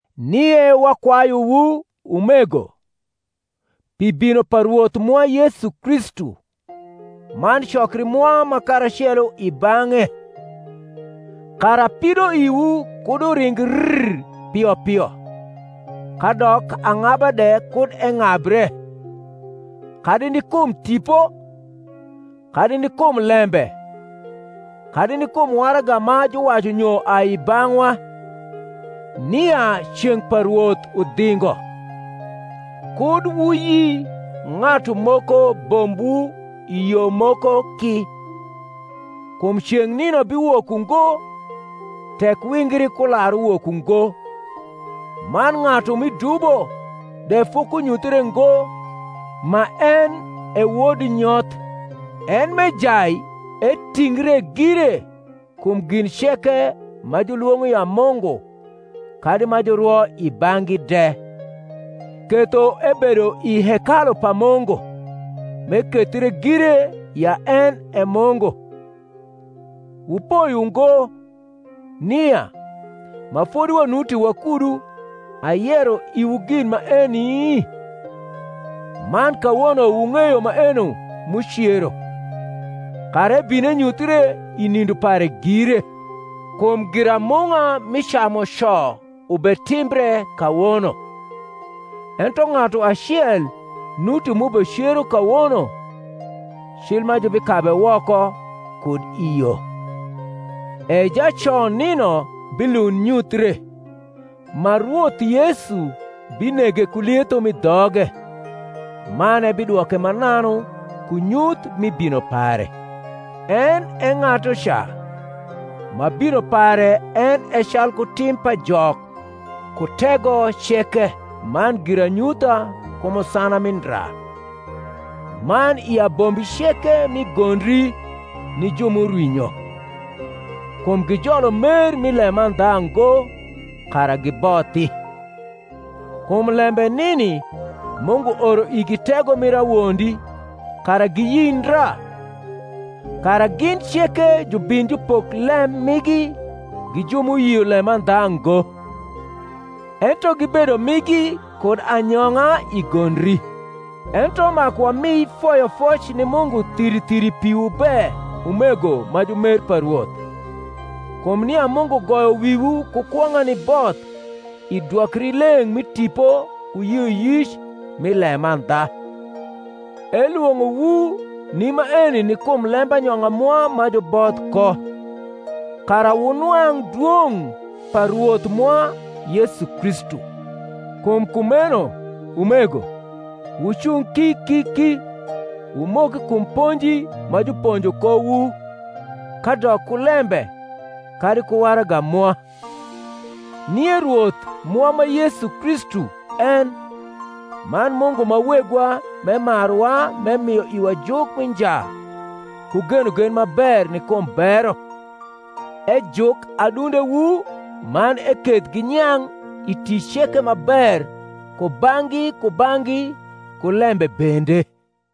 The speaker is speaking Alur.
Nie wakwayuwu, umego, pi bino pa Rwoth mwa Yesu Kristu, man cokri mwa ma karacelo i bang’e; kara pidoiwu kud uring rr pio pio, kadok ang’aba de kud eng’abre, kadi ni kum tipo, kadi ni kum lembe, kadi ni kum waraga ma juwacu nyo ai i bang’wa, nia ceng’ pa Rwoth udhingo; kud wuyi ng’atu moko bombwu i yo moko ki: kum ceng’ nino biwok ungo, tek wingri kularuwok ungo, man ng’atu mi dubo de fokunyuthre ngo, ma en e wod nyoth, en m’ejai etingre gire kum gin ceke ma julwong’o ya Mungu kadi ma jurwo i bang’gi de; ketho ebedo i hekalu pa Mungu, m’ekethre gire ya en e Mungu. Wupoi ungo, nia, ma fodi wanuti wakudu, ayero iwu gin maeni? Man kawono wung’eyo maeno m’ucero, kara ebin enyuthre i nindo pare gire. Kum giramung’a mi camuco ubetimbre kawono: ento ng’atu acel nuti m’ubecero kawono, cil ma jubikabe woko kud i yo. E jaco nino bilund nyuthre, ma Rwoth Yesu binege ku lietho m’i dhoge, man ebidwoke mananu ku nyuth mi bino pare: en e ng’atuca, ma bino pare en e calku tim pa Jok ku tego ceke man giranyutha ku musana mi ndra, man i abombi ceke mi gondri ni ju m’urwinyo; kum gijolo mer mi lemandha ngo, kara gibothi. Kum lembe nini Mungu oro igi tego mir awondi, kara giyi ndra: kara gin ceke jubin jupok lem migi gi ju m’uyio lemandha ngo, ento gibedo migi kud anyong’a i gondri. Ento maku wami foyofoc ni Mungu thiri thiri piwu be, umego ma jumer pa Rwoth, kum nia Mungu goyo wiwu ku kwong’a ni both i dwokrileng’ mi Tipo ku yioyic nn lemandha: elwong’owu ni maeni ni kum lembanyong’a mwa ma juboth ko, kara wunwang’ dwong’ pa Rwoth mwa Yesu Kristu. Kum kumeno, umego, wucung ki ki ki, wumok kum ponji ma juponjo kowu, kadok ku lembe, kadi ku waraga mwa. Nie Rwoth mwa ma Yesu Kristu en, man Mungu ma Wegwa m’emaruwa m’emio iwa juk mi nja ku genogen ma ber ni kum bero, ejuk adundewu man eketh ginyang’ i tic ceke ma ber kubang’gi kubang’gi ku lembe bende.